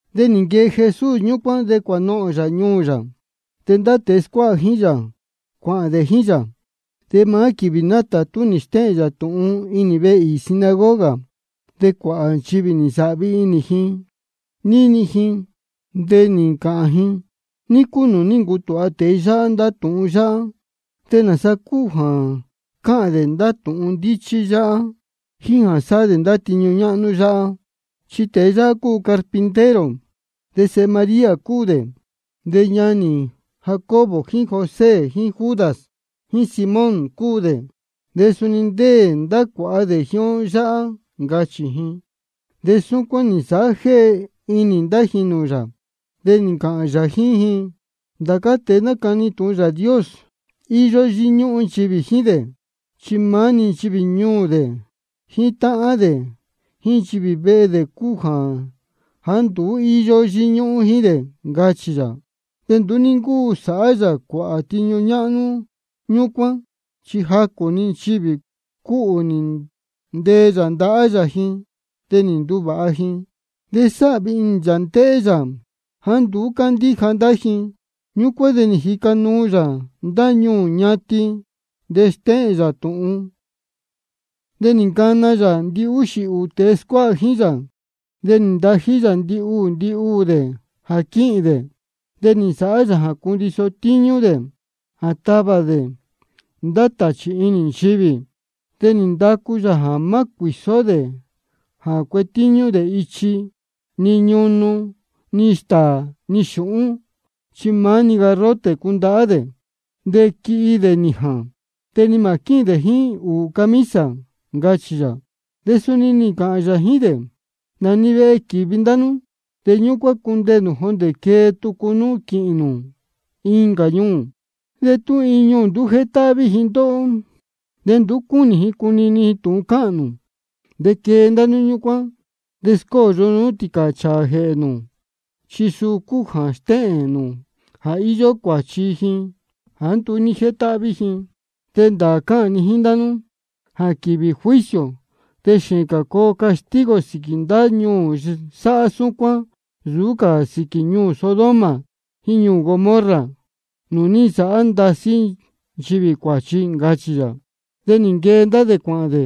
De nī nquee Jesús ñúcuán, de cuānohōn yā ñuū yā. De ndá tēe scuáha jíín yā, cuāhān dē jíín yā. De maá quīvī nátātú nī stéhēn yā tūhun inī vehe īī sinagoga. De cuāhā nchivī nī nsāhvi inī ji nī jini ji, de nī ncāhān ji: ¿Ní cúu nūū ní ncutūha tēe yáhá ndá tūhun yáhá? ¿De nāsa cúu jā cáhān dē ndá tūhun ndíchí yáhá jíín jā sáhá dē ndá tiñu ñáhnú yáhá? Chi tēe yáhá cúu carpintero, de sēhe María cúu dē, de ñanī Jacobo jíín José jíín Judas jíín Simón cúu dē. De suni ndéē ndá cuāha dē jíín ó yáhá, ncachī ji. De súcuán nī nsāhá jéhe inī ndá ji nūū yā. De nī ncāhān yā jíín ji: Ndācá tēe nácani tūhun Yāā Dios, íyó yíñúhún nchivī jíín dē, chi maá-ni nchivī ñuū dē, jíín táhán dē, jíín nchivī vehe dē cúu jāá nduú íyó yíñúhún jíín dē, ncachī yā. De nduú ní ncúu sāhá yā cuāhā tiñu ñáhnú ñúcuán. Chi jacū-ni nchivī cúhū nī ntee yā ndahá yā ji, de nī nduvāha ji. De sáhvi inī yā ndéhé yā jāá nduú cándíja ndá ji. Ñúcuán de nī jica nuu yā ndá ñuū ñatin, nī stéhēn yā tūhun. De nī ncana yā ndihúxī ūū tēe scuáha jíín yā, de nī ntají yā ndihuū ndihuū dē jā quíhīn dē. De nī nsāhá yā jā cundiso tíñú dē jā tavā dē ndá tāchī inī nchivī. De nī ndacu yā jā má cuīsó dē jā cuetíñú dē ichi, ni ñunu, ni stāā, ni xūhún. Chi maá garrote-ni cundahá dē. De quihi dē nījān, de ni mā quíhīn dē jíín ūū camisa, ncachī yā. De suni nī ncāhān yā jíín dē: Nā-ni vehe quīvi ndá nú, de ñúcuán cundeē nū jondē quee tucu nú quīhīn nū incā ñuū. De tú iin ñuū nduú jétáhví ji ndóhó, ni nduú cúnī ji cunini ji tūhun cáhān nū, de quee ndá nú ñúcuán, de scóyo nú tīcāchāā jēhē nū, chi suu cúu jā stéhēn nū jā íyó cuāchi ji jāá nduú ní jétáhví ji. De ndāā cáhān ni jíín ndá nú jā quīvī juicio de xēēn cā coo castigo sīquī ndá ñuū sáhá súcuán nsūú cā sīquī ñuū Sodoma jíín ñuū Gomorra nūū ní nsāhá ndasí nchivī cuāchi, ncachī yā. De nī nquee ndá dē cuāhān dē,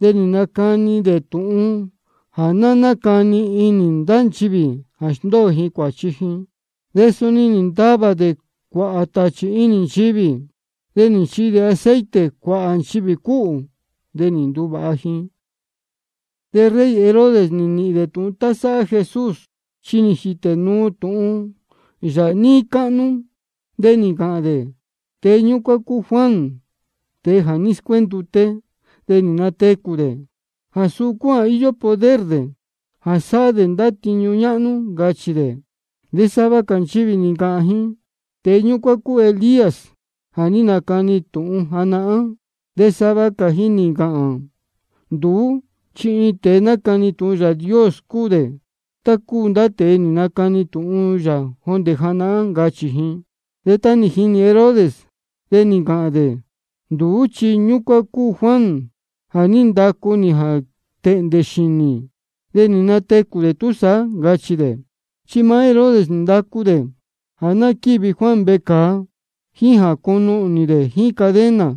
de nī nacani dē tūhun jā ná nácani inī ndá nchivī jā sndóo ji cuāchi ji. De suni nī ntavā dē cuāhā tāchī inī nchivī. De nī nchihi dē aceite cuāhā nchivī cúhū, de nī nduvāha ji. De rey Herodes nī nīhīn dē tūhun tá sáhá Jesús, chi nī jītē nuu tūhun yā níí cáhnú. De nī ncāhān dē: Tēe ñúcuán cúu Juan, tēe jā ní scuénduté, de nī natecū dē. Jā suu cúu jā íyó poder dē jā sáhá dē ndá tiñu ñáhnú, ncachī dē. De sava cā nchivī nī ncāhān ji: Tēe ñúcuán cúu Elías jā ní nacani tūhun janahán. De sava cā ji nī ncāhān: Nduú chi iin tēe nácani tūhun Yāā Dios cúu dē, tá cúu ndá tēe nī nacani tūhun yā jondē janahán, ncachī ji. De tá nī jini Herodes, de nī ncāhān dē: Nduú chi ñúcuán cúu Juan jā ní ndacu nī jā tēhndē xīnī, de nī natecū dē túsaá, ncachī dē. Chi maá Herodes nī ndacu dē jā ná quívi Juan vecāa, jíín jā cunuhnī dē jíín cadena.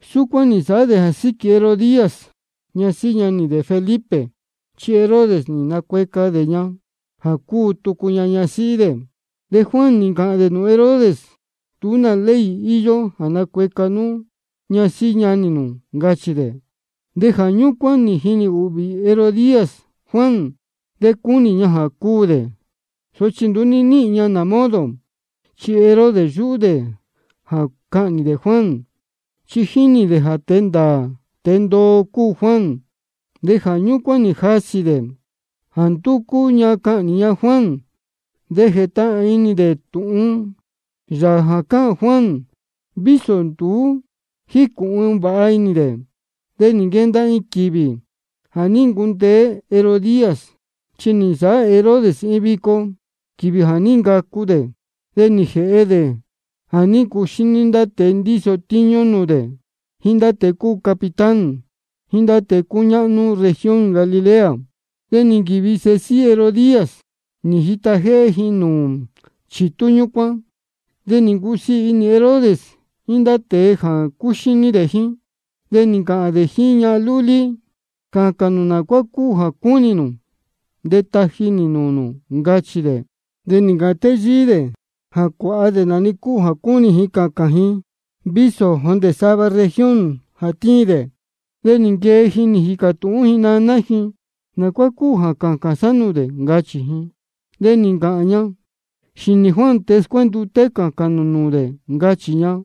Súcuán nī nsāhá dē jā síquī Herodías, ñasíhí ñanī dē Felipe. Chi Herodes nī nacueca dē ña jā cúu tucu ña ñasíhí dē. De Juan nī ncāhān dē nūū Herodes: Nduú nā ley íyó jā nacueca nú ñasíhí ñanī nū, ncachī dē. De jā ñúcuán nī jinī ūhvī Herodías Juan, de cúnī ña jā ná cúū dē, sochi nduú ní níhīn ña modo. Chi Herodes yúhú dē jā cahnī dē Juan, chi jínī dē jā tēe ndāā tēe ndoo cúu Juan. De jā ñúcuán nī jasī dē jā ndúcú ña cahnī ña Juan. De jétahān inī dē níni dē tūhun yā jā cáhān Juan, vísō nduú jícūhun vāha inī dē. De nī nquenda iin quīvī jā ní ncundeé Herodías. Chi nī nsāhá Herodes iin vico quīvī jā ní ncacu dē, de nī jēhe dē jā ní ncuxíní ndá tēe ndíso tíñú nūū dē, jíín ndá tēe cúu capitán, jíín ndá tēe cúñáhnú región Galilea. De nī nquīvi sēhe síhí Herodías, nī jita jéhé ji nūū chitú ñúcuán. De nī ncusiī inī rey Herodes jíín ndá tēe jā cúxíní jíín dē. De nī ncāhān dē jíín ñahan lúlí: Cācān nā cuá cúnī nū de taji nī nūū nū, ncachī dē. De nī ncāhān téyíí dē jā cuāha dē nā-ni cúu jā cúnī ji cācān ji, vísō jondē sava región jā tíin dē. De nī nquee ji nī jīcā tūhún ji naná ji: ¿Nā cuá cúu jā cācān sá nūū dē? ncachī ji. De nī ncāhān ña: Xīnī Juan tēe scuénduté cācān nū nūū dē, ncachī ña.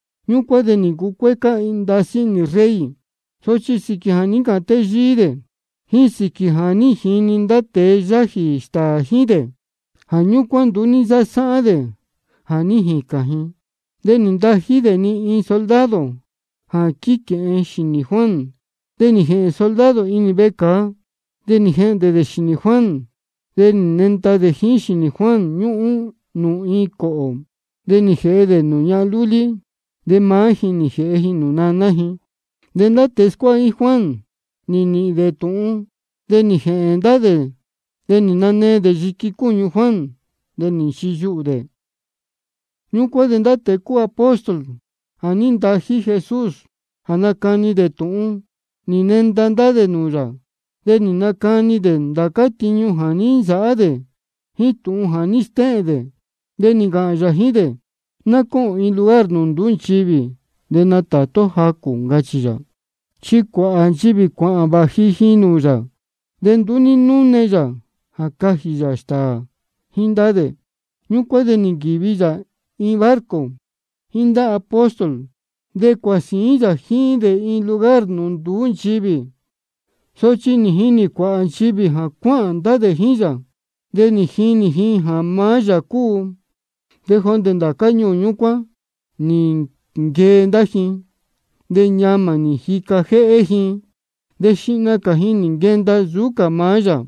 Ñúcuán de nī ncucuécá ndasí inī rey. Sochi sīquī jā ní ncāhān téyíí dē, jíín sīquī jā ní jini ndá tēe yájī stāā jíín dē, jā ñúcuán nduú ní nsásáhán dē jā ní jīcān ji. De nī ntají dē-ni iin soldado jā quíquēhen dē xīnī Juan. De nī jēhēn soldado inī vecāa, de nī jehndē dē xīnī Juan. De nī nenda dē jíín xīnī Juan, ñúhún nūū iin cōhō. De nī jēhe dē nūū ñahan lúlí, de maá ji nī jēhe ji nūū naná ji. De ndá tēe nī scuáha jíín Juan nī nīhīn dē tūhun, de nī jēhēn ndá dē, nī nanee dē yiqui cúñu Juan, de nī nchiyuhū dē. Ñúcuán de ndá tēe cúu apóstol jā ní ntají Jesús jā nacani tūhun, nī nenda ndá dē nūū yā. De nī nacani dē ndācá tiñu jā ní nsāhá dē, jíín tūhun jā ní stéhēn dē. De nī ncāhān yā jíín dē: Ná cóhōn iin lugar nūū nduú nchivī, de natātú ó jacū, ncachī yā. Chi cuāhā nchivī cuāhān vāji ji nūū yā, de nduú ní núne yā jā cajī yā stāā jíín ndá dē. Ñúcuán de nī nquīvi yā iin barco jíín ndá apóstol, de cuāhān sīín yā jíín dē iin lugar nūū nduú nchivī. Sochi nī jinī cuāhā nchivī jā cuáhān ndá dē jíín yā, de nī jinī ji jā maá yā cúu. De jondē ndācá ñuū ñúcuán nī nquee ndá ji, de ñamā nī jica jéhé ji, de xihna cā ji nī nquenda nsūú cā maá yā.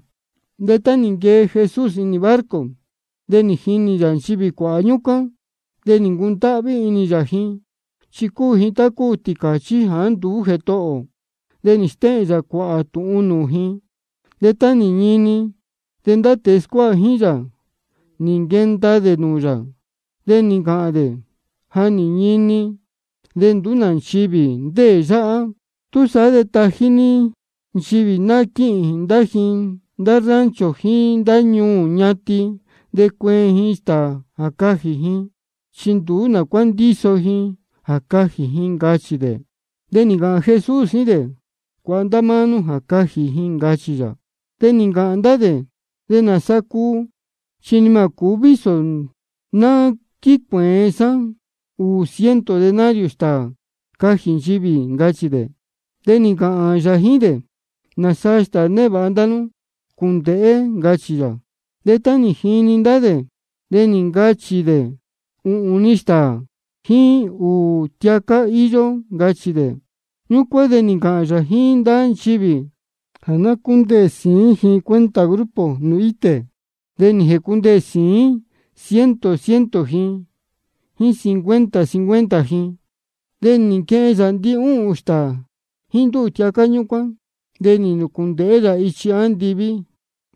De tá nī nquee Jesús inī barco, de nī jinī yā nchivī cuāhā ñúcuán. De nī ncundáhví inī yā ji, chi cúu ji tá cúu tīcāchí jāá nduú jētohō tī. De nī stéhēn yā cuāhā tūhun nūū ji. De tá nī ñini, de ndá tēe scuáha jíín yā, nī nquenda dē nūū yā, de nī ncāhān dē: Ja nī ñini, de nduú nā nchivī ndéē yáhá. Túsaá de tají ní nchivī ná quíhīn ndá ji ndá rancho jíín ndá ñuū ñatin, de cueen ji stāā cajī ji, chi nduú nā cuá ndíso ji jā cajī ji, ncachī dē. De nī ncāhān Jesús jíín dē: Cuāha ndá máá nú jā cajī ji, ncachī yā. De nī ncāhān ndá dē: ¿De nāsa cuu? Chi ni mā cūú vísō ná quícuēen sá ūū ciento denario stāā cajī nchivī, ncachī dē. De nī ncāhān yā jíín dē: ¿Nāsaa stāā névāha ndá nú? Cuándēhé, ncachī yā. De tá nī jinī ndá dē, de nī ncachī dē: Uhūn-ni stāā jíín ūū tiacá íyó, ncachī dē. Ñúcuán de nī ncāhān yā jíín ndá nchivī jā ná cúndeē sīín ji cuenta grupo nūū itē. De nī jēcundeē sīín ciento ciento ji, jíín cincuenta cincuenta ji. De nī nquehen yā ndihúhūn stāā jíín ndúū tiacá ñúcuán, de nī nūcūndēhé yā ichi andiví,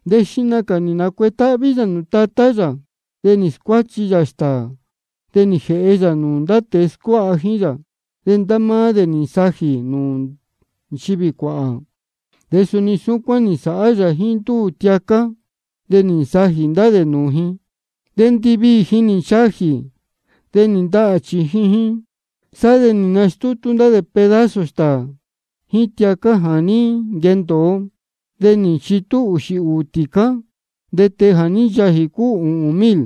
de xihna cā nī nacuetáhví yā nūū Tatá yā. De nī scuáchi yā stāā, de nī jēhe yā nūū ndá tēe scuáha jíín yā, de ndá máá dē nī nsajī nūū nchivī cuāhā. De suni súcuán nī nsāhá yā jíín ndúū tiacá, de nī nsajī ndá dē nūū ji. De ndiviī ji nī nchajī, de nī ndahā chījin ji. Sá de nī nastútú ndá dē pedazo stāā jíín tiacá jā ní nquendōo, de nī nchitú ūxī ūū tīcá. De tēe jā ní nchajī cúu ūhūn mil.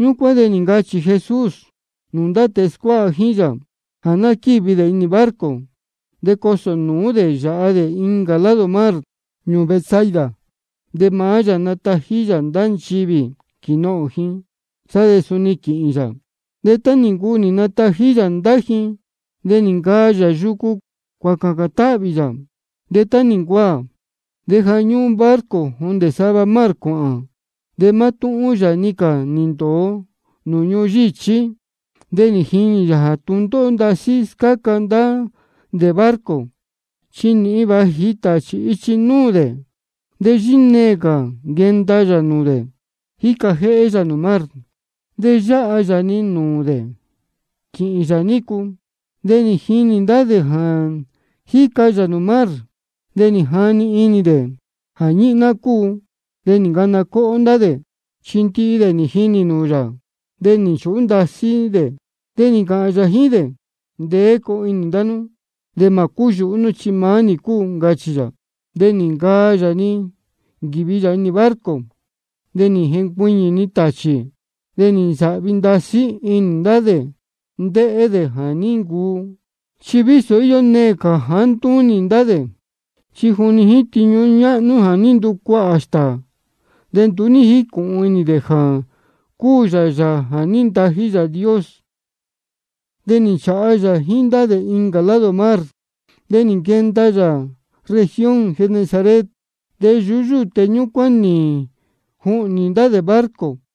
Ñúcuán de nī ncachī-ni Jesús nūū ndá tēe scuáha jíín yā jā ná quívi dē inī barco, de cosō nūú dē yāha dē incā lado mar ñuū Betsaida. De maá yā natají yā ndá nchivī quīnohōn ji, sá de suni quīhīn yā. De tá nī ncuu nī natají yā ndá ji, de nī ncaa yā yucu cuācācān táhvī yā. De tá nī ncuaā, de ja ñúhún barco jondē sava mar cuāhān, de mátúhún yā-ni cā nī ndōo nūū ñuhun yíchí. De nī jinī yā jā tūndóhó ndasí scáca ndá dē barco, chi nīhin vāji tāchī ichi núū dē. De yíneē cā nī nquenda yā nūū dē, jíca jéhé yā nūū mar. De yáha yā-ni nūū dē quīhīn yā nícu. De nī jinī ndá dē jā jíca yā nūū mar, de nī jani inī dē jā ñíhná cúu, de nī ncana cóhó ndá dē. Chi ndihi dē nī jinī nūū yā, de nī nchūhú ndasí dē. De nī ncāhān yā-ni jíín dē: Ndeé coo inī ndá nú, de mā cúyūhú nú, chi maá nī cúu, ncachī yā. De nī ncaa yā nī nquīvi yā inī barco, de nī jencuiñī-ni tāchī. De nī nsāhvi ndasí inī ndá dē ndéhé dē jā ní ncuu. Chi íyó neē cā jāá ntúnī ndá dē, chi juni jíín tiñu ñáhnú jā ní nducuahā stāā, de nduú ní jícūhun inī dē jā cúu yā Yāā jā ní ntají Yāā Dios. De nī nchāha yā jíín ndá dē incā lado mar, de nī nquenda yā región Genesaret. De yuhú ndúté ñúcuán nī juhnī ndá dē barco.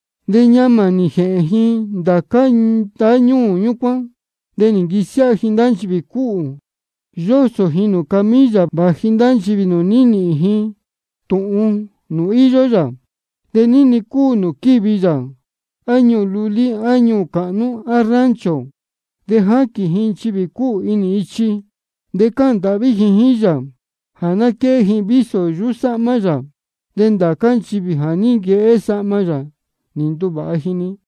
De ñamā nī jēhēn ji ndācá ndáñúū ñúcuán, de nī nquisiáha ji ndá nchivī cúhū, yósō ji nūū camilla, vāji ndá nchivī nūū ní nīhīn ji tūhun nūū íyó yā. De ní-ni cúu nūū ní nquīvi yā, á ñuū lulí, á ñuū cāhnú, á rancho, de jáquīn ji nchivī cúhū inī ichi, de cáhān ndāhví ji jíín yā jā ná quéhé ji vísō yuhú sáhmá yā. De ndācá nchivī jā ní nquehé sahma yā, nī nduvāha ji-ni.